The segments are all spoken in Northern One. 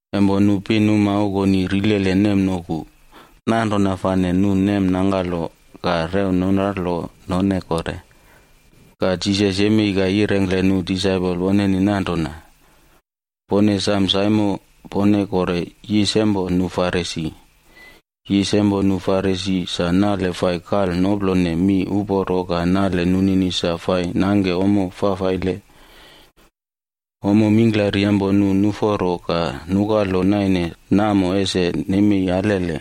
Empo nu pinuma okoni rilele nemnoku, nanrona fane nu nemnangkalo ka rew nunralo none kore. Ka Jisas yemei ka yirengkle nu disaipol woneni nanrona, “Pone sam saimo pone kore yisa empo nu Farisi. Yis empo nu Farisi sa nale fai kal noplone mi uporo ka nale nunini sa fai nangke ommo fafaile. Ommo mingklari empo nu nuforo ka nukalo naine namo ese nemei alele.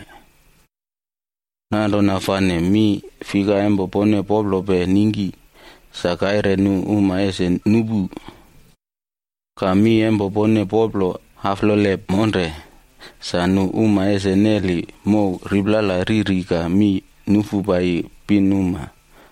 Nanrona fane mi fika empo pone poplope ningki, sa kaire nu uma ese nupu. Ka mi empo pone poplo aflole monre, sa nu uma ese neli mow riplala riri ka mi nufu paiyi pinuma.”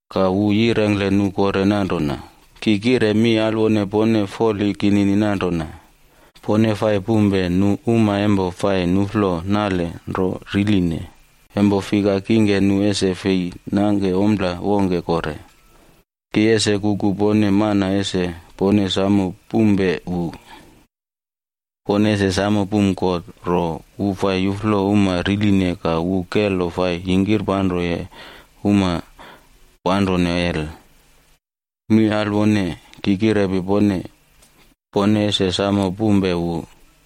Ka wu yirengkle nu kore nanrona, “Ki kire mi alwone pone foli kinini nanrona, pone fai pumpe nu uma empo fai nuꞌflo nale nro riline, empo fika kingke nu ese fei nangke ompla wongke kore. Ki ese kuku pone mana ese pone samo pumpe wu. Pone ese samo pum God ro wu fai yuflo uma riline ka wu kelo fai yingkirpanroye uma panrone hel. Mi alwone! Ki kirepi pone, pone ese samo pumpe wu.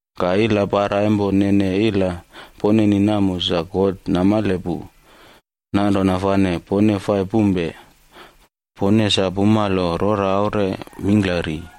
Ka ilapara empo nene ila poneni namo sa God namale pu. Nanrona fane pone fai pumpe, pone sa pumalo rora aure mingklari.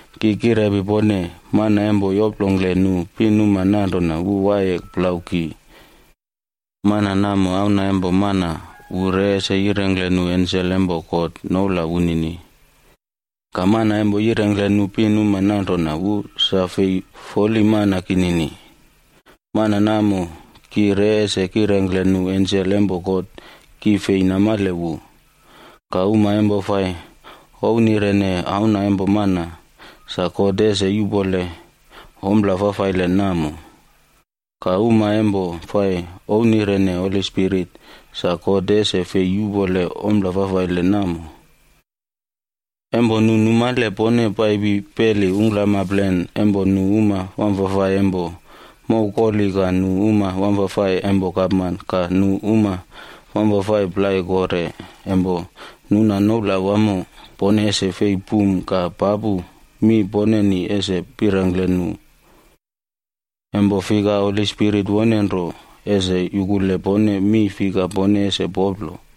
“Ki kirepi pone, mana empo yoplongkle nu pinuma nanrona wu waiye plau ki, mana namo Auna empo Mana wu re ese yirengkle nu ensel empo God noula wunini. Ka mana empo yirengkle nu pinuma nanrona wu sa fei foli mana kinini, mana namo ki re ese kirengkle nu ensel empo God ki fei namale wu. Ka uma empo fai ouwnirene Auna empo Mana, sa God ese yuꞌpole ompla fafaile namo. Ka uma empo fai ouwnirene Holi Spirit, sa God ese fei yuꞌpole ompla fafaile namo. “Empo nu numale pone paipi peli ungklamplen empo nu uma wamfafai empo mow koli ka nu uma wamfafai empo gapman ka nu uma wamfafai plai kore empo nuna noula wamo, pone ese fei pum ka papu mi poneni ese pirengkle nu. Empo fika Holi Spirit wone nro ese yukule pone mi fika pone ese poplo.”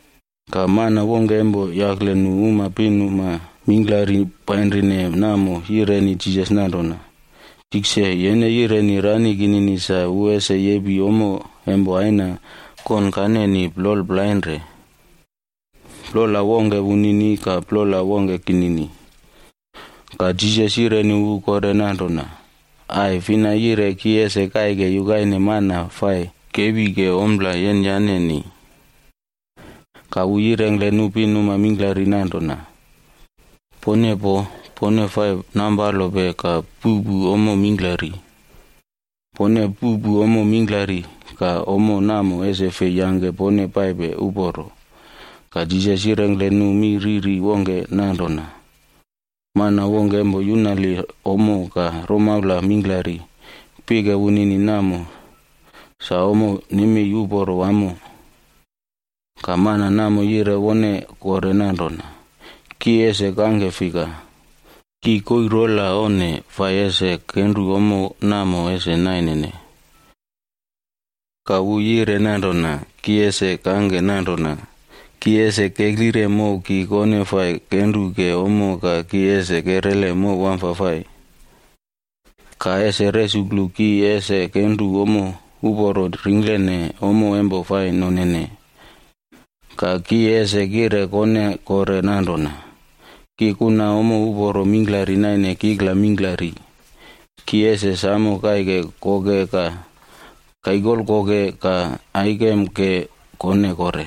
Ka mana wongke empo yakle nu uma pinuma mingklari painrine namo yireni Jisas nanrona, “Tikse, yene yireni rani kinini sa wu ese yepi ommo empo aina konkaneni plol plainre. Plola wongke wunini ka plola wongke kinini.” Ka Jisas yireni wu kore nanrona, “Ai! Fina yire ki ese kaike yukaine mana fai kepi ke ompla yenyaneni?” Ka wu yirengkle nu pinuma mingklari nanrona, “Pone poo! Pone fai nampalope ka puꞌpu ommo mingklari. Pone puꞌpu ommo mingklari ka ommo namo ese fei yangke pone paipe uporo.” Ka Jisas yirengkle nu mi riri wongke nanrona, “Mana wongke empo yunali ommo ka romaula mingklari, pike wunini namo sa ommo nemei uporo wamo. Ka mana namo yire wone kore nanrona, ‘Ki ese kangke fika? Ki koii rola onne fai ese kenru ommo namo ese nainene.’ “Ka wu yire nanrona, ‘Ki ese kangke nanrona, ki ese keklire mow ki kone fai kenru ke ommo ka ki ese kerele mow wamfafai. Ka ese resuklu ki ese kenru ommo uporo ringklene ommo empo fai nonene. Ka ki ese kire kone kore nanrona, “Ki kuna ommo uporo mingklari naine kikla mingklari. Ki ese samo kaike koke ka kaikolkoke ka aikem ke kone kore.” ’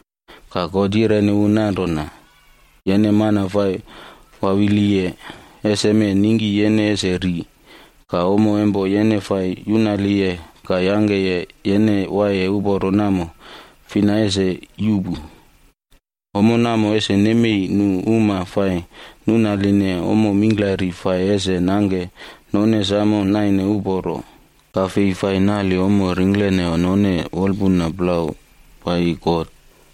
“Ka God yireni wu nanrona, ‘Yene mana fai wawiliye! Eseme ningki yene ese ri ka ommo empo yene fai yunaliye ka yangke yene waiye uporo namo fina ese yuꞌpu?’ “Ommo namo ese nemei nu uma fai nunaline ommo mingklari fai ese nangke none samo naine uporo, ka fei fai nali ommo ringklene none wolpuna plau paiyi God.”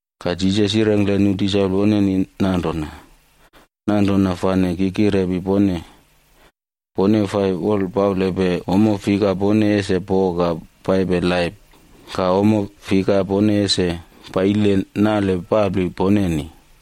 Ka Jisas yirengkle nu disaipol woneni nanrona, “Nanrona fane ki kirepi pone, pone fai wolpaulepe ommo fika pone ese po ka paipe laip, ka ommo fika pone ese paile nale papli poneni.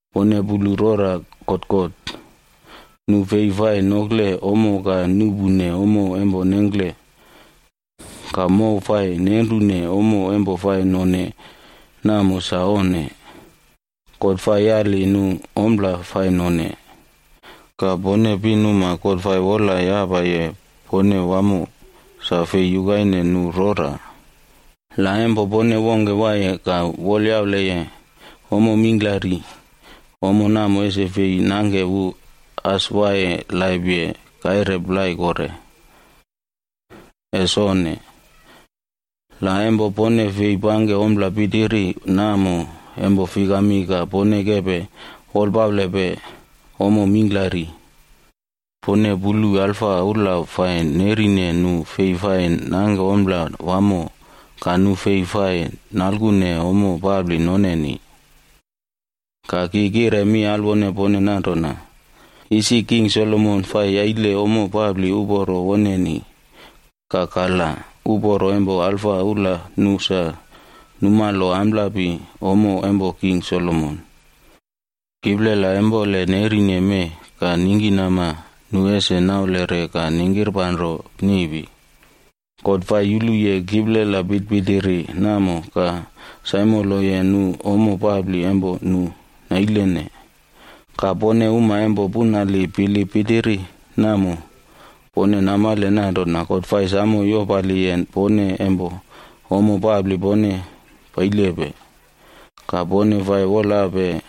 Pone pulu rora kotkot, nu fei fai nokle ommo ka nuꞌpune ommo empo nengkle, ka mow fai nenrune ommo empo fai none namo sa onne. God fai yali nu ompla fai none. Ka pone pinuma God fai wolayapaye pone wamo, sa fei yukaine nu rora. La empo pone wongke waiye ka wolyauleye ommo mingklari, ommo namo ese fei nangke wu as waiye laipye kaire plai kore. Ese onne! La empo pone fei pangke ompla pitiri namo empo fikami ka pone kepe wolpaulepe ommo mingklari? “Pone pulu alfa ula fai nerine nu fei fai nangke ompla wamo ka nu fei fai nalkune ommo papli noneni. Ka ki kire mi alwone pone nanrona, isi King Solomon fai yaile ommo papli uporo woneni, ka kalab uporo empo alfa ula nu sa numalo amplapi ommo empo King Solomon. Kiplela empole nerine mee ka ningkinama nu ese naulere ka ningkirpanro niꞌpi. God fai yuluye kiplela pitpitiri namo ka saimoloye nu ommo papli empo nu nailene. Ka pone uma empo punali bilip pitiri namo, pone namale nanrona God fai samo yopaliye pone empo ommo papli pone pailepe. Ka pone fai wolape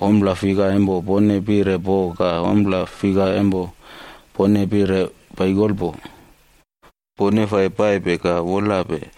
ompla fika empo pone pire po ka ompla fika empo pone pire paikolpo. Pone fai paipe ka wolape.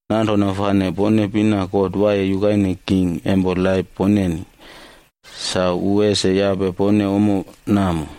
Nanrona fane pone pina God waiye yukaine king empo laip poneni. Sa wu ese yape pone ommo namo.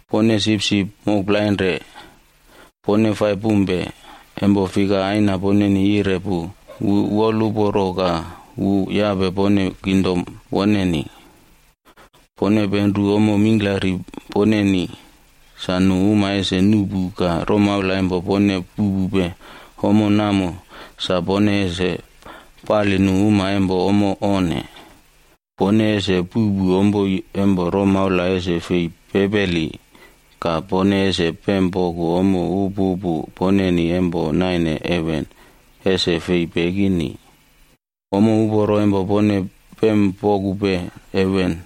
“Pone sipsip mokplainre, pone fai pumpe, empo fika Aina poneni yire pu wu woluporo ka wu yape pone kingdom woneni. Pone penru ommo mingklari poneni sa nu uma ese nuꞌpu ka romaula empo pone puꞌpupe ommo namo sa pone ese pali nu uma empo ommo onne. Pone ese puꞌpu ompoi empo romaula ese fei pepeli ka pone ese pempoku ommo upupu poneni empo naine heven, ese fei pekini. Ommo uporo empo pone pempokupe heven,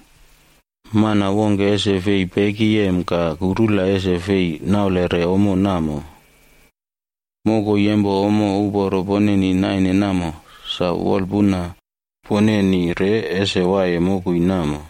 mana wongke ese fei pekiyem ka kurula ese fei naulere ommo namo. Mokoi empo ommo uporo poneni naine namo, sa wolapuna poneni re ese waiye mokoi namo.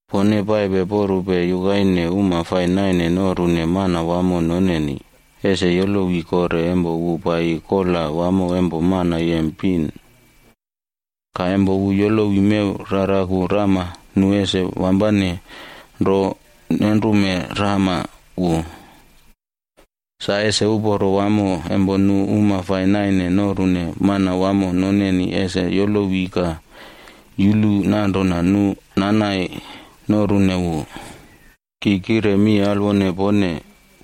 Pone paipe porupe yukaine uma fai naine norune manawamo noneni, ese yolowi kore empo wu paiyi kola wamo empo mana yem pin. Ka empo wu yolowi mew raraku rama nu ese wampane nro nenrume rama wu. Sa ese uporo wamo empo nu uma fai nangkene ommo naine norune manawamo noneni ese yolowi ka yulu nanrona nu nanai norune wu. Ki kire mi alwone pone,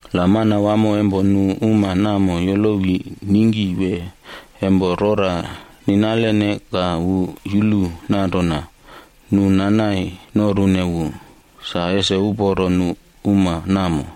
La manawamo empo nu uma namo yolowi ningki wee empo rora ninalene ka wu yulu nanrona nu nanai norune wu, sa ese uporo nu uma namo.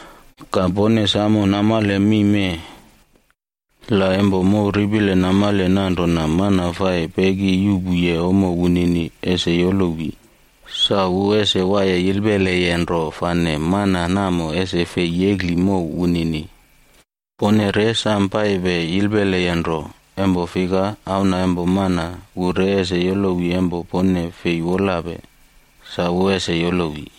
“Ka pone samo namale mi mee: la empo mow ripile namale nanrona mana fai peki yuꞌpuye ommo wunini ese yolowi, sa wu ese waiye yilpeleye nro fane mana namo ese fei yekli mow wunini. Pone re sam paipe yilpelepe nro, empo fika Auna empo Mana wu re ese yolowi empo pone fei wolape, sa wu ese yolowi.”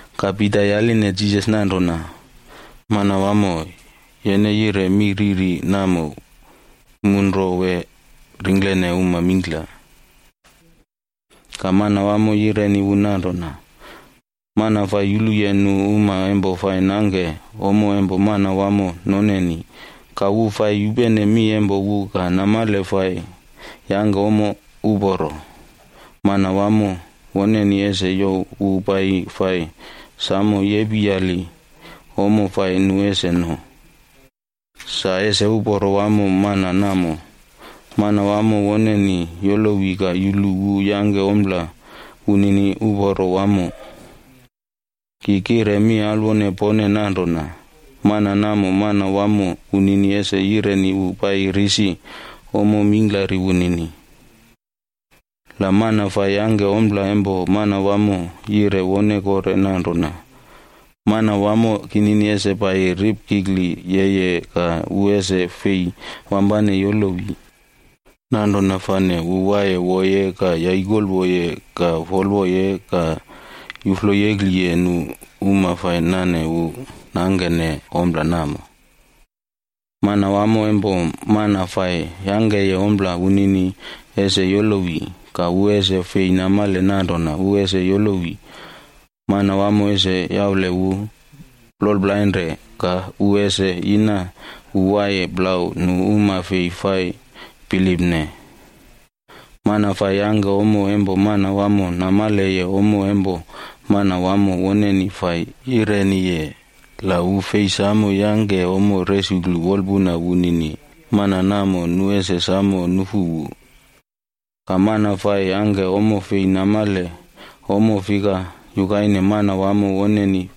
Ka Pita yaline Jisas nanrona, “Manwamo, yene yire mi riri namo mu nro wee ringklene uma mingkla?” Ka Manwamo yireni wu nanrona, “Mana fai yuluye nu uma empo fai nangke ommo empo manawamo noneni, ka wu fai yupene mi empo wu ka namale fai yangke ommo uporo, manawamo woneni ese youw wu paiyi fai samo yepiyali ommo fai nu ese no. Sa ese uporo wamo mana namo, manawamo woneni yolowi ka yulu wu yangke ompla wunini uporo wamo. Ki kire mi alwone pone nanrona mana namo manawamo wunini ese yireni wu paiyi risi ommo mingklari wunini. La mana fai yangke ompla empo manawamo yire wone kore nanrona, ‘Mana wamo kinini ese paiyi ripkikli yeye ka wu ese fei wampane yolowi,’ nanrona fane wu waiye woye ka yaikolwoye ka folwoye ka yufloyekliye nu uma fai nane wu nangkene ompla namo. Manawamo empo mana fai yangkeye ompla wunini ese yolowi, ka wu ese fei namale nanrona wu ese yolowi. Manawamo ese yaule wu ploplainre ka wu ese yina wu waiye plau nu uma fei fai bilipne. “Mana fai yangke ommo empo manawamo namaleye ommo empo manawamo woneni fai yireniye, la wu fei samo yangke ommo resuklu wolpuna wunini, mana namo nu ese samo nufu wu. Ka mana fai yangke ommo fei namale ommo fika yukaine manawamo woneni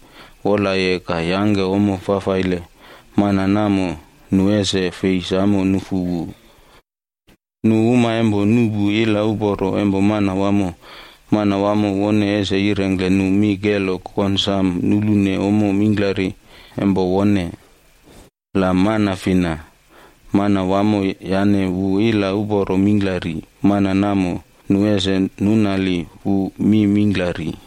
wolaye ka yangke ommo fafaile, mana namo, nu ese fei samo nufu wu. Nu uma empo nuꞌpu ila uporo empo manawamo, manawamo wone ese yirengkle nu mi kelo konsam nulune ommo mingklari empo wone. La mana fina, manawamo yane wu ila uporo mingklari, mana namo nu ese nunali wu mi mingklari.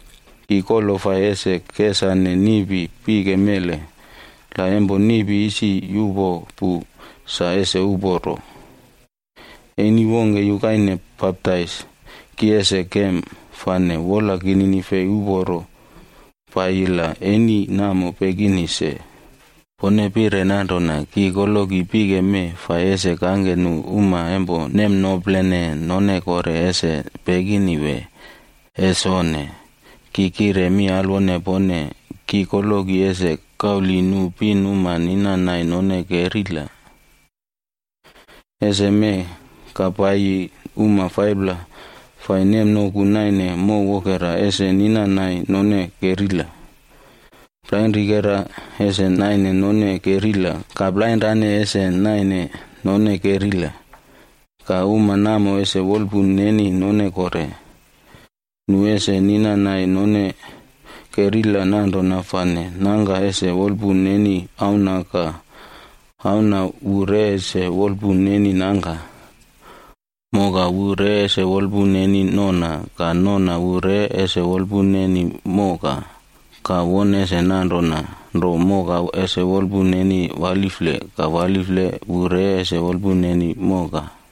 “Ki kolo fai ese kesane niꞌpi pike mele, la empo niꞌpi isi yuꞌpo pu sa ese uporo. Eni wongke yukaine baptaisd ki ese kem, fane wola kinini fei uporo paiyi la eni namo pekini se. Pone pire nanrona ki koloki pike mee fai ese kangke nu uma empo nemnoplene none kore ese pekini wee? Ese onne! Ki kire mi alwone pone, ki koloki ese kauli nu pinuma ninanai none kerila. Eseme ka paiyi uma 5pla fai nemnoku naine mow wokera ese ninannai none kerila. Plainrikera ese naine none kerila ka plainrane ese naine none kerila. Ka uma namo ese wolpun neni none kore. Nu ese ninanai none kerila nanrona fane nangka ese wolpun neni auna ka auna wu re ese wolpun neni nangka. Moka wu re ese wolpun neni nona ka nona wu re ese wolpun neni moka, ka won ese nanrona nro moka ese wolpun neni walifle, ka walifle wu re ese wolpun neni moka.”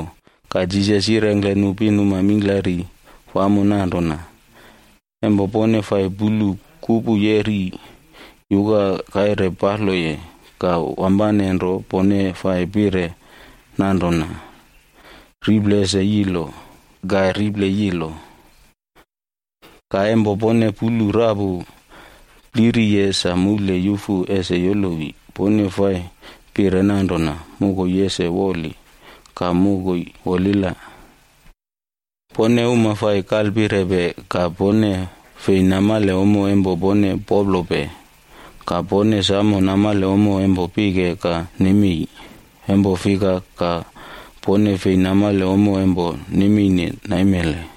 Ka Jisas yirengkle nu pinuma mingklari wamo nanrona, “Empo pone fai pulu kupu yeri yuka kaire paloye, ka wampane nro pone fai pire nanrona, ‘Riple ese yilo,’ ka riple yilo. Ka empo pone pulu rapu pliriye sa moule yufu ese yolowi, pone fai pire nanrona, ‘Mokoi ese woli,’ ka mokoi wolila. Pone uma fai kalpirepe ka pone fei namale ommo empo pone poplope. Ka pone samo namale ommo empo pike ka nemi. Empo fika ka pone fei namale ommo empo nemeine taim naimele?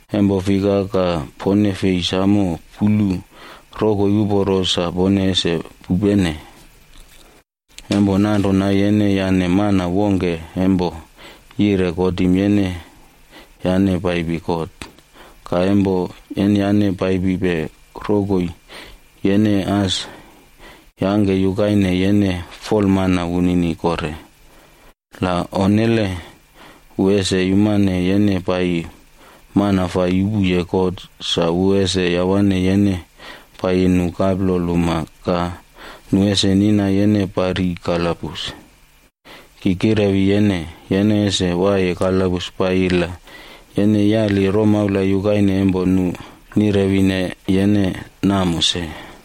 “Empo fika ka pone fei samo pulu rokoi uporo sa pone ese pupene? Empo nanrona yene yane mana wongke empo yire kotim yene yane paipi kot, ka empo yenyane paipipe rokoi, yene as yangke yukaine yene folmana wunini kore. La onnele, wu ese yumane yene paiyi mana fai yupuye kot sa wu ese yawane yene paiyi nu kaplol uma ka nu ese nina yene pari kalabus. Ki kirewi yene, yene ese waiye kalabus paiyi la yene yali romaula yukaine empo nu nirewine yene namo se.”